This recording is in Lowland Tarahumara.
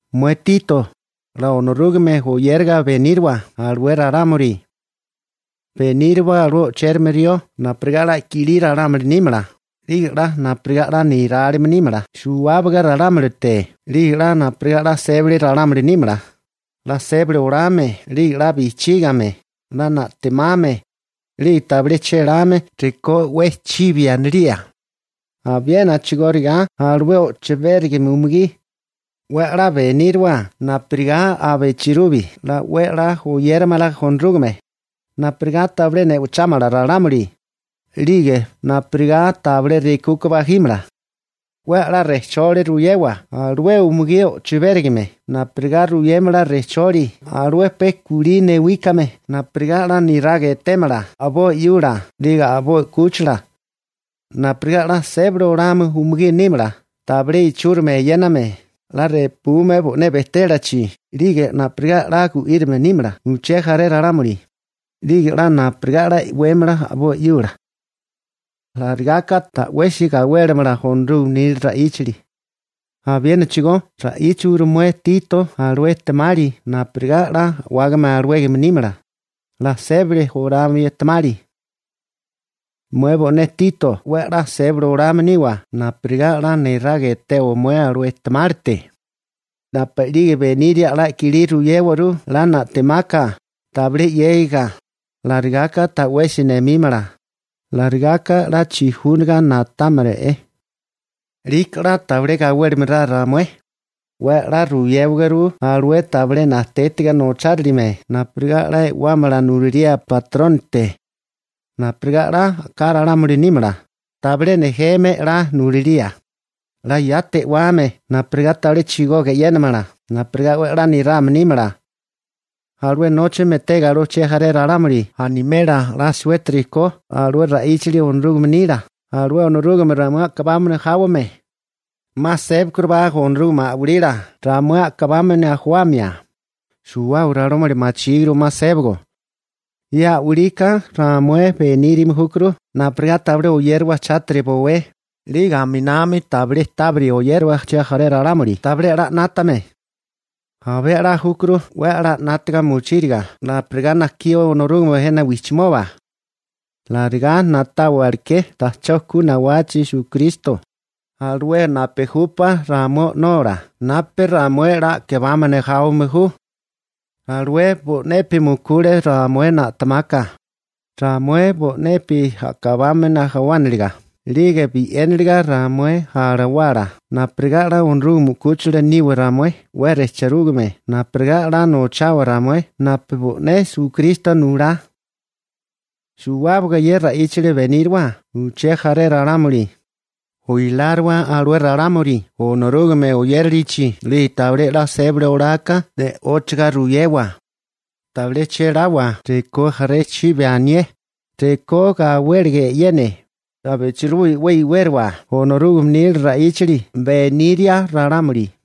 Mué Tito, 'la Onorúgame oyériga beníriwa alué ralámuli. Beníriwa alué o'chérame rió napurigá 'la kilí ralámuli nímala, 'lige 'la napurigá 'la nirálime nímala suwábaga ralámulite, 'lige napurigá 'la sébali ralámuli nímala, 'la sébali olame 'lige 'la bijchígame, 'la na'temame, 'lige tabilé chéláme rekó 'we chibi anilía. Abiena a'chigóriga alué o'chibérigame umugí, 'we 'la beníriwa napurigá abichilubi 'la 'we 'la oyéramala Onorúgame, napurigá tabilé ne'ochámala ralámuli, 'lige napurigá tabilé rekuka bajímala. 'We 'la rejcholi ruyewa alué umugí o'chibérigame napurigá ruyémala rejcholi alué pe kulí newíkame napurigá 'la niraga etémala a'boi 'yula 'lige a'boi 'kúchila, napurigá 'la sébali olame umugí nímala, tabilé ichúrimi eyéname, 'la repume bo'né bejtélachi 'lige napurigá 'la gu'írame nímala uché jaré ralámuli, 'lige 'la napurigá 'la e'wémala a'boi 'yula. Alarigá ka ta'wesi gawélimala Onorúgame nila ra'íchali. Abiénachigó ra'íchawaguru mué Tito alué ejtemali napurigá 'la a'wágame alawégame nímala, 'la sébali olame ejtemali. Mué bo'né Tito 'we 'la sébali olame niwa napurigá 'la niraga etewa mué alué ejtemálite. Napu'lige beniria 'la kilí ruyéwaguru 'la na'temaka, tabilé 'yégiga, alarigaka ta'wesi nemímala, alarigaka 'la chijúniga na'támala'é. 'Liko 'la tabilé gawélimala ramué. 'We 'la ruyéwaguru alué tabilé najtétiga nochárilime napurigá 'la e'wámala nulalía batrónite, napurigá 'la a'ká ralámuli nímala, tabilé nejeme nulilía, 'la yati e'wame napurigá tabilé chigoga e'yénamala, napurigá 'we 'la nirame nímala. Alué nóchame etega alué uché jaré ralámuli animela 'la suétiri ko alué ra'íchali Onorúgame nila, alué Onorúgame ramué a'kabámana jáwame. 'Ma sébakurubá Onorúgame a'walila ramué a'kabámana jawamia. Suwábaga ralámuli machíguru 'ma sébago. Ye a'walika ramué benírame júkuru napurigá tabilé oyérawa chátiri bowé 'lige aminami tabilé tábiri oyériwa uché jaré ralámuli tabilé 'la 'nátame. Abé 'la júkuru 'we 'la 'nátaga mochíriga napurigá najkí Onorúgame jena wijchimoba. Alarigá na'táwaliké ta'chó ku nawachi Esukristo, alué napu júpá ramué O'nola napu ramué 'la a'kabámana jáwame ju. Alué bo'nepi mukule ramué na'temaka, ramué bo'nepi a'kabámana jawániliga 'lige bi'éniliga ramué alawala napurigá 'la Onorúgame 'kúchila niwa ramué 'we rejchirúgame napurigá 'la nochawa ramué napu bo'né Esukristo nulá. Suwábaga ye ra'íchali beníriwa uché jaré ralámuli, oiláriwa alué ralámuli Onorúgame oyérilichi 'lige tabilé 'la sébali oláká ne'óchiga ruyewa. Tabilé chéláwa rekó jaré chibi anié, rekó gawéliga e'yene, abichilubi 'we iwériwa Onorúgame nila ra'íchali beniria ralámuli.